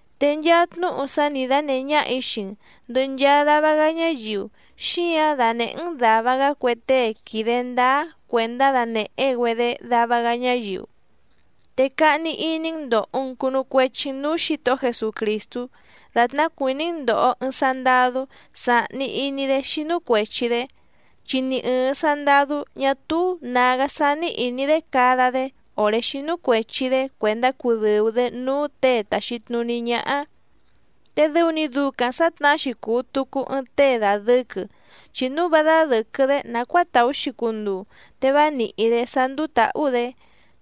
Te nchaa tnúhu sá nǐ dánèhé ñáhà‑í xii‑n ndɨ̀hɨ nchaa dava‑gá ñáyiu, xíǎⁿ danèhé‑n dàva‑gá cue tée quìde ndáá cuèndá danèhé‑güedé dava‑gá ñáyiu. Te cahni iní‑n ndòho‑n cunu cuechi‑n núú Xǐtohó Jesucrìstú dàtná cuìní‑n ndòho ɨɨⁿ sandadú sàhni iní‑dé xínú cuèchi‑dé. Chi ni ɨ̀ɨⁿ sandadú ñá túú nǎgá sání ìní‑dé cada‑dé òré xínú cuèchi‑dé cuèndá cudɨ̀u‑dé núú těe tàxi tnuní ñáhá. Te dɨu‑ni ducaⁿ sǎtnahá‑xi cùu tucu ɨɨⁿ tée dàdɨquɨ, chi núu vá dádɨ̀quɨ‑dé nàcuáa tàú‑xi cunduu te vá nìhí‑dé sá ndúú tǎhú‑dě.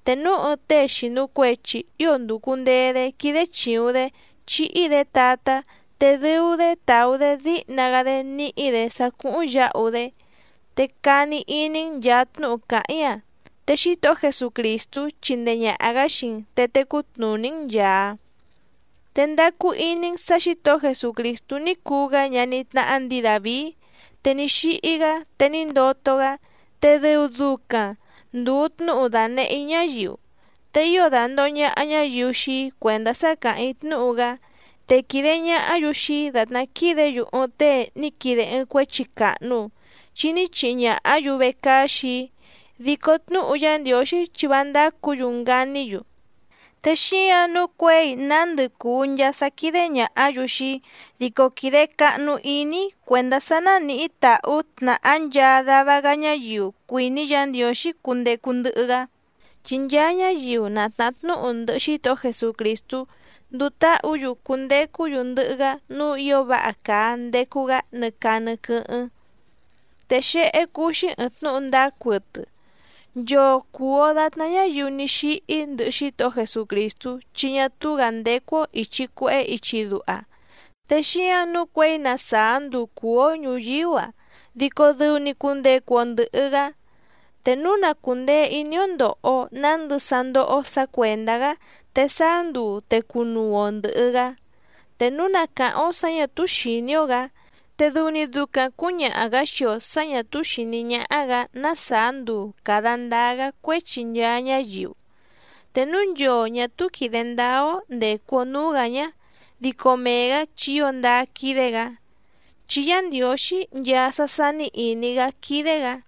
Te núu ɨɨⁿ tée xìnu cuechi ío ndùcu ndee‑dé quídé chìuⁿ‑dé chíhí‑dě tatá, te dɨu‑dé tàú‑dé díhna‑gá‑dé níhí‑dě sá cúhúⁿ yǎhu‑dé. Te cani iní‑n nchàa tnúhu càháⁿ‑í‑a, te Xítohó Jesucrìstú chindee ñàha‑gá xii‑n te tecú tnùní‑n nchàa. Te ndacu iní‑n sǎ Xǐtohó Jesucrìstú ní cuu‑gá ñaní tnáhá ndǐi Dàvií, te ní xíhí‑gá te ní ndoto‑gá, te dɨu ducaⁿ ndùu tnúhu dànehé‑í ñáyiu. Te ío dàndoho ñaha ñáyiu xii‑í cuèndá sá càháⁿ‑í tnúhu‑gá, te quìde ñahá‑yu xii‑í dàtná quídě‑yu ɨɨⁿ tée ní quide ɨɨⁿ cuéchi càhnu, chi ní chihi ñàhá‑yu vecaá xii‑í, dico tnúhu Yá Ndiǒxí chi vá ndácǔ‑yu nganí‑yu. Te xíǎⁿ nǔu cuěi nándɨ cùu nchaa sá quídé ñàhá‑yu xii‑í, dico quìde cahnu iní‑í cuèndá sá nánìhí tàhú tnàhá nchaa dava‑gá ñáyiu cuìní Yǎ Ndiǒxí cundecu ndɨhɨ‑gá, chi nchaa ñáyiu na tnàhá tnúhu ndɨhɨ Xítohó Jesucrìstú nduu táhǔ‑yu cundecú‑yu ndɨhɨ‑gá núú ǐo váha càa ndecu‑gá nɨ caa nɨ quɨ́hɨ́ⁿ. Te xéhé cúú‑xí ɨ̀ɨⁿ tnúhu ndáá cuɨtɨ: Nchoo cùu‑o datná ñáyiu ní xíhí ndɨhɨ Xítohó Jesucrìstú chi ñá túú‑gǎ ndécú‑ó ìchi cuehé ichi duha, te xíǎⁿ nǔu cuěi na sàá nduu cùú‑ó ñùyíú‑a, dico dɨu‑ni cundecu‑o ndɨ̀hɨ‑gá. Te núu na cùndee iní‑ó ndòho‑o nándɨ sá ndóhó‑ó sǎ cuèndá‑gá, te sáá nduu te cunuu‑o ndɨ̀hɨ‑gá. Te núu na càháⁿ‑ó sǎ ñà túú xìní‑ó‑gǎ, te dɨu‑ni ducaⁿ cǔñaha‑gǎ xii‑o sǎ ñà túú xìní ñáhá‑gǎ ná sàá nduu càda ndáá‑gá cuéchi nchaa ñáyiu. Te núu nchoo ñà túú quìde ndáá‑ó ndècu‑o núú‑gǎ ñá, dico mee‑gǎ chi ío ndáá quídé‑gǎ, chi Yá Ndiǒxí nchaa sá sání ìní‑gá quídé‑gǎ.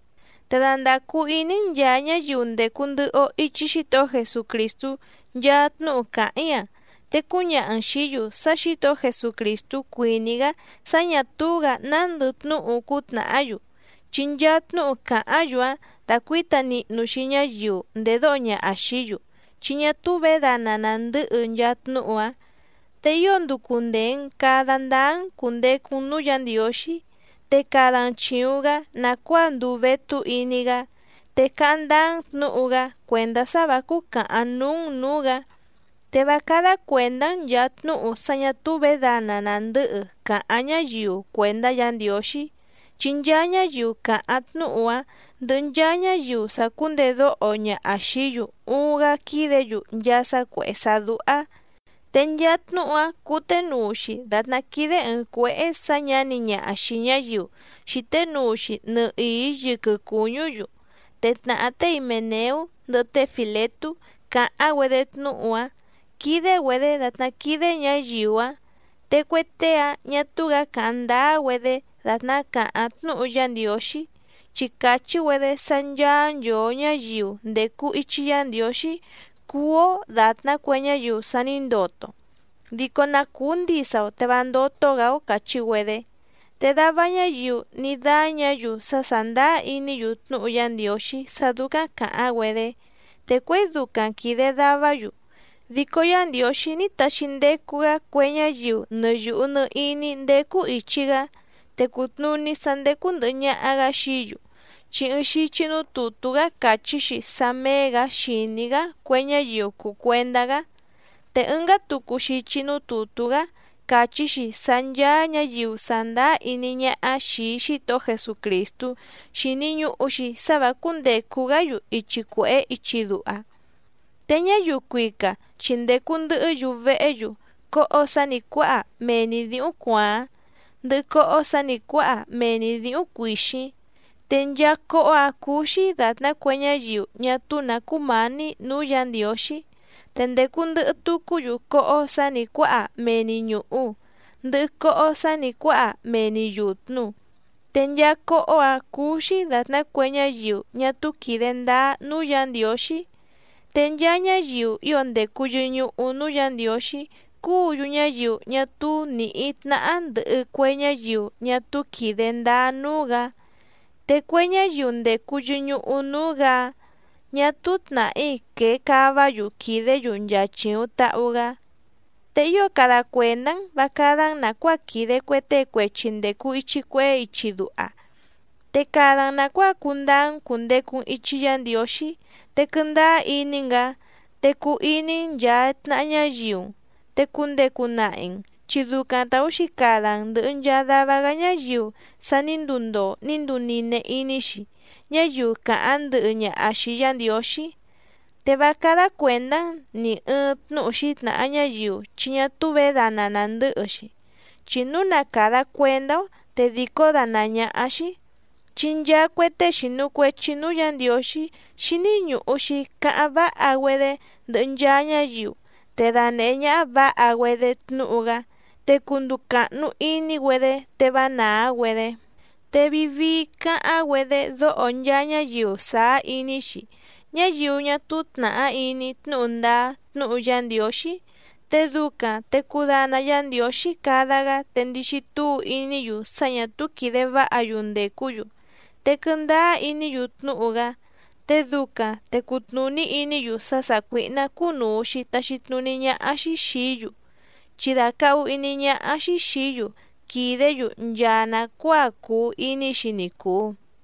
Te dandàcu iní‑n nchàa ñáyiu ndècu ndɨhɨ‑o ichi Xítohó Jesucrìstú nchaa tnúhu càháⁿ‑í‑a, te cúñaha‑n xìí‑yu sá Xǐtohó Jesucrìstú cuìní‑gá sá ñà túú‑gǎ nándɨ tnúhu cútnàhá‑yu, chi nchaa tnúhu càháⁿ‑yu‑áⁿ dácuǐta nihnu‑xi ñáyiu ndèdóho ñaha xìí‑yu, chi ñá túú vědana nàndɨ́hɨ nchaa tnúhu‑áⁿ. Te ío nducu ndèe‑n cada ndáá‑n cùndecu‑n núú Yǎ Ndiǒxí, te cada‑n chìuⁿ‑gá nàcuáa nduu vétú iní‑gá, te cáháⁿ ndáá‑n tnǔhu‑gá, cuèndá sá vǎ cúcàhaⁿ núú‑n nǔú‑gǎ. Te vá cádá cuèndá‑n nchàa tnúhu sá ñà túú vědana nàndɨ́hɨ càháⁿ ñáyiu cuèndá Yǎ Ndiǒxí, chi nchaa ñáyiu càháⁿ tnúhu‑áⁿ ndɨhɨ nchaa ñáyiu sàcúndedóho ñaha xìí‑yu uuⁿ‑gá quídě‑yu nchaa sá cuèhé sá dúhá. Te nchaa tnúhu‑áⁿ cǔténuu‑xi dàtná quídé ɨ̀ɨⁿ cuéhé sǎ ñǎni ñaha xìi ñáyiu xìté nuu‑xi nɨhìí yɨquɨ cùñú‑yu. Te tnàhá té Himèneú ndɨhɨ té Fìletú càháⁿ‑güedé tnúhu‑áⁿ quídé‑güedě dàtná quídé ñǎyiu‑áⁿ. Te cue tée‑áⁿ ñà túú‑gǎ càháⁿ ndáá‑güedé dàtná càháⁿ tnúhu Yá Ndiǒxí, chi càchí‑güedé sá ncháá nchòo ñáyiu ndècu ichi Yá Ndiǒxí cúú‑ó dàtná cue ñáyiu sa ní ndoto, dico na cùú ndisa‑o te vá ndótó‑gǎ‑ó càchí‑güedé. Te dava ñáyiu ní dáñǎ‑yu sá sàndáá iní‑yu tnúhu Yá Ndiǒxí sá dúcáⁿ càháⁿ‑güedé. Te cuěi ducaⁿ quìde davá‑yu, dico Yá Ndiǒxí ní taxi ndecu‑gá cue ñáyiu nɨ yùhu nɨ iní ndécú ìchi‑gá, te cùtnuní sá ndécú ndɨ̀hɨ ñaha‑gá xií‑yu, chi ɨɨⁿ xichi núú tùtú‑gá càchí‑xi sá méé‑gǎ xìní‑gá cue ñáyiu cùu cuendá‑gá. Te ɨngá tucu xichi núú tùtú‑gá càchí‑xi sá ncháá ñǎyiu sàndáá iní ñáhá xìi Xítohó Jesucrìstú xíní ñùhu‑xi sá vǎ cúndècu‑gá‑yu ichi cuèhé ichi duha. Te ñáyiu cuica chi ndècu ndɨhɨ́‑yu vehé‑yu cóhó sǎ nǐ cuáha mee‑ni dǐhúⁿ cuàáⁿ, ndɨhɨ cóhó sǎ nǐ cuáha mee‑ni dǐhúⁿ cuìxíⁿ, te nchaa cóhó‑ǎⁿ cúú‑xí dàtná cue ñáyiu ñá túú nǎ cúmǎní nǔú Yǎ Ndiǒxí. Te ndècu ndɨhɨ tucú‑yu cóhó sǎ nǐ cuáha mee‑ni ñùhu, ndɨhɨ cóhó sǎ nǐ cuáha mee‑ni yùtnu, te nchaa cóhó‑ǎⁿ cúú‑xí dàtná cue ñáyiu ñá túú quìde ndáá núú Yǎ Ndiǒxí. Te nchaa ñáyiu ío ndècu yɨñuhu núú Yǎ Ndiǒxí cúǔ‑yu ñáyiu ñá túú nìhí tnáhá ndɨ̀hɨ cue ñáyiu ñá túú quìde ndáá núú‑gǎ, te cue ñáyiu ndècu yɨñuhu núú‑gǎ‑áⁿ ñà túú tnàhí quée cáva‑yu quìdé‑yu nchaa chìuⁿ tahu‑gá. Te ío cada cuèndá‑n vǎ cádá‑n nàcuáa quìde cue tée cuechi ndècu ichi cuehé ichi duha, te cada‑n nàcuáa cundáá‑n cùndecu‑n ichi Yá Ndiǒxí, te quɨndáá iní‑n‑gǎ, te cuu iní‑n nchàa tnaha ñáyiu‑n, te cundecu nahi‑n, chi ducaⁿ tàú‑xi cada‑n ndɨ̀hɨ nchaa dava‑gá ñáyiu sa ní nduu ndoo ní nduu nine iní‑xi ñáyiu càháⁿ ndɨhɨ ñaha xìi Yá Ndiǒxí. Te vá cádá cuèndá‑n nì ɨɨⁿ tnúhu xǐtnàha ñáyiu chi ñá túú vědana nàndɨ́hɨ‑xi, chi núu na càda cuendá‑ó te dìcó dánàá ñáhá‑xí. Chi nchaa cue tée xìnu cuechi núú Yǎ Ndiǒxí xíní ñùhu‑xi cáháⁿ váha‑güedé ndɨhɨ nchaa ñáyiu, te danèhé ñáhá vǎha‑güedé tnúhu‑gá, te cunduu càhnu iní‑güedé te vá nàá‑güedé. Te vii vii cáháⁿ‑güedé dóho nchaa ñáyiu sàá iní‑xi, ñáyiu ñá túú tnàhá iní tnúhu ndáá tnúhu Yá Ndiǒxí, te ducaⁿ te cudana Yá Ndiǒxí cada‑gá te ndixi túu iní‑yu sá ñà túú quìde váha‑yu ndècú‑yu te quɨndáá iní‑yu tnúhu‑gá. Te ducaⁿ te cutnùní iní‑yu sá sàcuíhná cúnùu‑xi taxi tnuní ñáhá‑xí xìí‑yu, chi dàcahu iní ñáhá‑xí xìí‑yu quìdé‑yu nchaa nàcuáa cùu iní‑xi ni cùu.